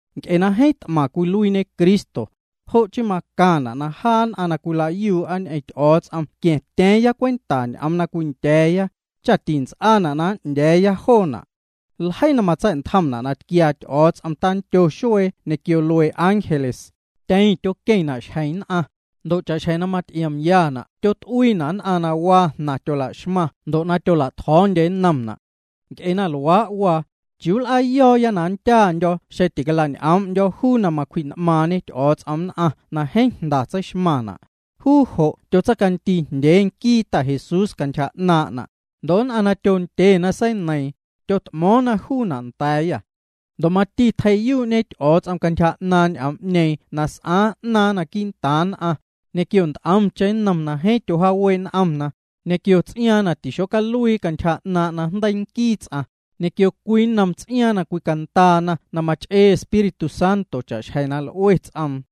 Nc'e na jeeⁿ t'maⁿ cwiluiiñe Cristo, jo' chii macaⁿna' na jaa nn'aⁿ na cwila'yuu'a ñ'eⁿ Ty'o̱o̱ts'om qua̱ⁿtya̱a̱cheⁿ cwenta ñ'oom na cwindya̱a̱ya, tints'aana' na n'ndya̱a̱ya joona'. Ljeii na matsa̱'ntjomna' na tquiaa Ty'o̱o̱ts'om tandyo xuee ñequio luee ángeles, tyeⁿ tyoqueⁿna' xjeⁿ nn'aⁿ, ndo' cha'xjeⁿ na maty'iomyana' tyot'uiina' nn'aⁿ na waa jnaⁿ tyolaxmaⁿ ndo' tyola'tjo̱o̱ndyena nnom juuna'. Nc'e na luaa' waa, ¿chiuu nl'aa na nndyaandyo̱ xeⁿ tila'ñ'o̱o̱ⁿ'ndyo̱ juu na macwji'n'maaⁿñe Ty'o̱o̱ts'om nn'aⁿ na jeeⁿ jnda tseixmaⁿ juuna'? Juu jo' tyotseicandii jndyee nquii Ta Jesús cantyja 'naaⁿ'na', ndo' nn'aⁿ na tyondye na seineiiⁿ, tyot'mo̱o̱ⁿna juuna' nda̱a̱yâ. Ndo' mati tjei'yuu'ñe Ty'o̱o̱ts'om cantyja 'naaⁿ' ñ'oom'ñeeⁿ na s'aaⁿ 'naaⁿ quii'ntaaⁿ nn'aⁿ, ñequio nt'omcheⁿ nnom na jeeⁿ tyojaawee' n'omna, ñequio ts'iaaⁿ na tixocaluiina' cantyja 'naaⁿ' najndeii nquii ts'aⁿ, ñequio cwii nnom ts'iaaⁿ na cwicandaana na mach'ee Espíritu Santo cha'xjeⁿ na l'ue ts'oom.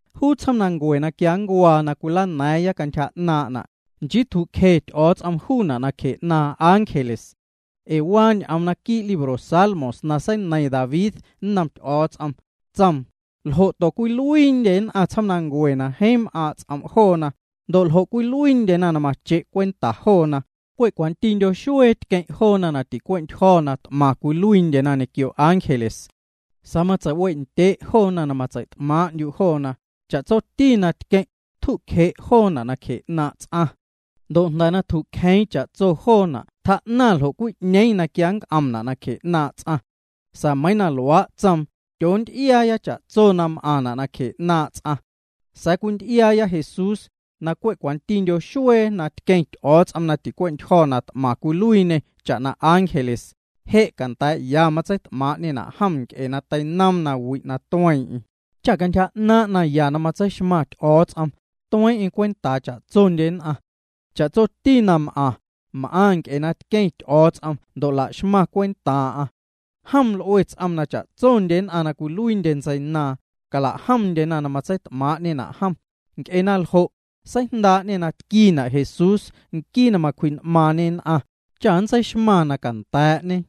Juu tsjoomnancue na quia ncuaa na cwilana̱a̱ⁿya cantyja 'naaⁿ'na', nchii tju'cje Ty'o̱o̱ts'om juuna' nacje 'naaⁿ ángeles. Ee waa ñ'oom naquii' libro Salmos na seineiⁿ David nnom Ty'o̱o̱ts'om. Tsoom: ¿Ljo'to cwiluiindye nn'aⁿ tsjoomnancue na jeeⁿ m'aaⁿ' ts'om' joona? Ndo' ¿ljo' cwiluiindyena na mache' cwenta joona? Cwe' cwantindyo xuee tqueⁿ' joona na ticue'ntyjo̱ na t'maⁿ cwiluiindyena ñequio ángeles. Sa̱a̱ matseiwe'ndye' joona na matsei't'maaⁿ'ndyu' joona, cha'tsoti na tqueⁿ', tju'cje' joona' nacje 'naaⁿ' ts'aⁿ. Ndo' na tju'cjeeⁿ cha'tsoti tjaa'naⁿ na 'ñeeⁿ na quia nnc'omna' nacje 'naaⁿ' ts'aⁿ. Sa̱a̱ meiⁿ na luaa' tsoom, tyoonty'iaaya cha'tsoti na m'aⁿna' nacjee 'naaⁿ' ts'aⁿ. Sa̱a̱ cwinty'iaaya Jesús, na cwe' cwantindyo xuee na tqueⁿ Ty'o̱o̱ts'om na ticuee'ntyjo̱ na t'maⁿ cwiluiiñê cha'na ángeles, je' canda̱a̱'ya matseit'maaⁿ'ñena' jom nc'e na teinoom nawi' na tueeⁿ'eⁿ, cha cantyja 'naaⁿ' naya na matseixmaⁿ Ty'o̱o̱ts'om, tueeⁿ'eⁿ cwentaa cha'tsondye nn'aⁿ. Cha'tsoti na m'aⁿ, m'aⁿ nc'e na tqueⁿ Ty'o̱o̱ts'om ndo' laxmaⁿ cwentaaⁿ'aⁿ. Jom l'ue ts'oom na cha'tsondye nn'aⁿ na cwiluiindyena ntseinaaⁿ, cala'jomndyena na matseit'maaⁿ'ñena' jom. Nc'e na ljo', seijndaa'ñê na tquiina' Jesús cha nntseixmaⁿ na canda̱a̱'ñe, nquii na macwji'n'maaⁿñe nn'aⁿ.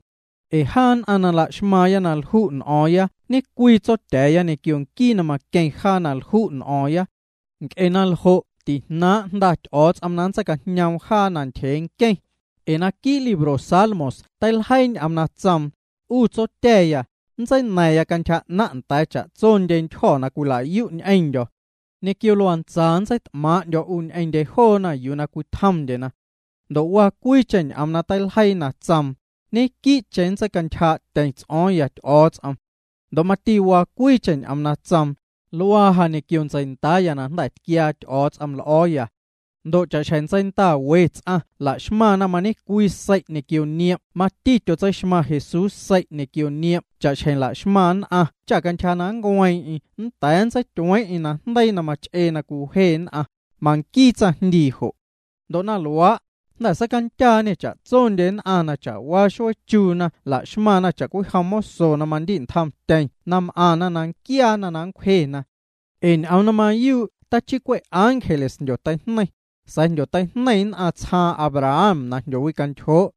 Ee jaa nn'aⁿ na la'xmaaⁿya na lju' n'o̱o̱ⁿya ñecwii Tsotya̱a̱ya ñequio nquii na maqueⁿ jaa na lju' n'o̱o̱ⁿya. Nc'e na ljo' tijnaaⁿ' Jnda Ty'o̱o̱ts'om na nntseicajñoom jaa ntyjee nqueⁿ. Ee naquii' libro Salmos teiljeii ñ'oom na tsoom: 'U Tsotya̱ya, nntseina̱ⁿya cantyja 'naⁿ' nda̱a̱ cha'tso ndyentyjo̱ na cwila'yu' ñ'eⁿndyo̱. Ñequio luantsa nntseit'maaⁿ'ndyo̱ 'u ñ'eⁿndye joona yuu na cwitjomndyena. Ndo' waa cwiicheⁿ ñ'oom na teiljeii na tsoom: Ñequii'cheⁿ nntseicantyjaa'tyeⁿ ts'o̱o̱ⁿya Ty'o̱o̱ts'om. Ndo' mati waa cwiicheⁿ ñ'oom na tsoom: Luaa ja ñequio ntseindaaya na jnda̱ tquiaa Ty'o̱o̱ts'om l'o̱o̱. Ndo' cha'xjeⁿ ntseinda we ts'aⁿ laxmaⁿna mañecwii sei' ñequio niom' mati tyotseixmaⁿ Jesús sei' ñequio niom' cha'xjeⁿ laxmaⁿ nn'aⁿ cha cantyja na nncueeⁿ'eⁿ nnda̱a̱ nntseityueeⁿ'eⁿ najndeii na mach'ee na cwiwje nn'aⁿ, manquii tsaⁿjndii jo'. Ndo' na luaa', jnda̱ seicandyaañê cha'tsondye nn'aⁿ na cha'waa xuee chuuna na la'xmaⁿna cha'cwijom moso na mandi'ntjomtyeⁿ na m'aⁿna na nquiaana na nncwjena. Ee ñ'oom na mayuu' tachii cwe' ángeles na jndyoteijneiⁿ, sa̱a̱ jndyoteijneiⁿ nn'aⁿ tsjaaⁿ Abraham na jndyoteincoo'.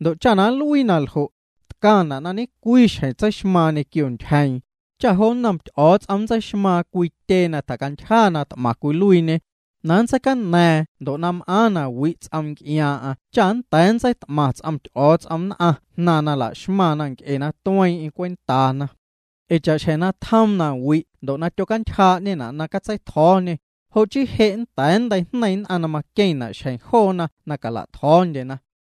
Ndo' cha na nluii na ljo', tcaⁿna' na ñecwii xjeⁿ tseixmaaⁿ ñequio ntyjeeⁿ, cha jo nnom Ty'o̱o̱ts'om nntseixmaaⁿ cwii tyee na tjacantyja na t'maⁿ cwiluiiñê, na matseicana̱a̱ⁿ ndo' na m'aaⁿ na wi' ts'oom nc'iaaⁿ'aⁿ cha nnda̱a̱ nntseit'maⁿ ts'om Ty'o̱o̱ts'om nn'aⁿ jnaⁿ na laxmaⁿna nc'e na tueeⁿ'eⁿ cwentaana. Ee cha'xjeⁿ na tjoom nawi' ndo' tyocantyjaa'ñena' na catseitjo̱o̱ñê, jo' chii je' nnda̱a̱ nnteijneiⁿ nn'aⁿ na maqueⁿna' xjeⁿ joona na nla'tjo̱o̱ndyena.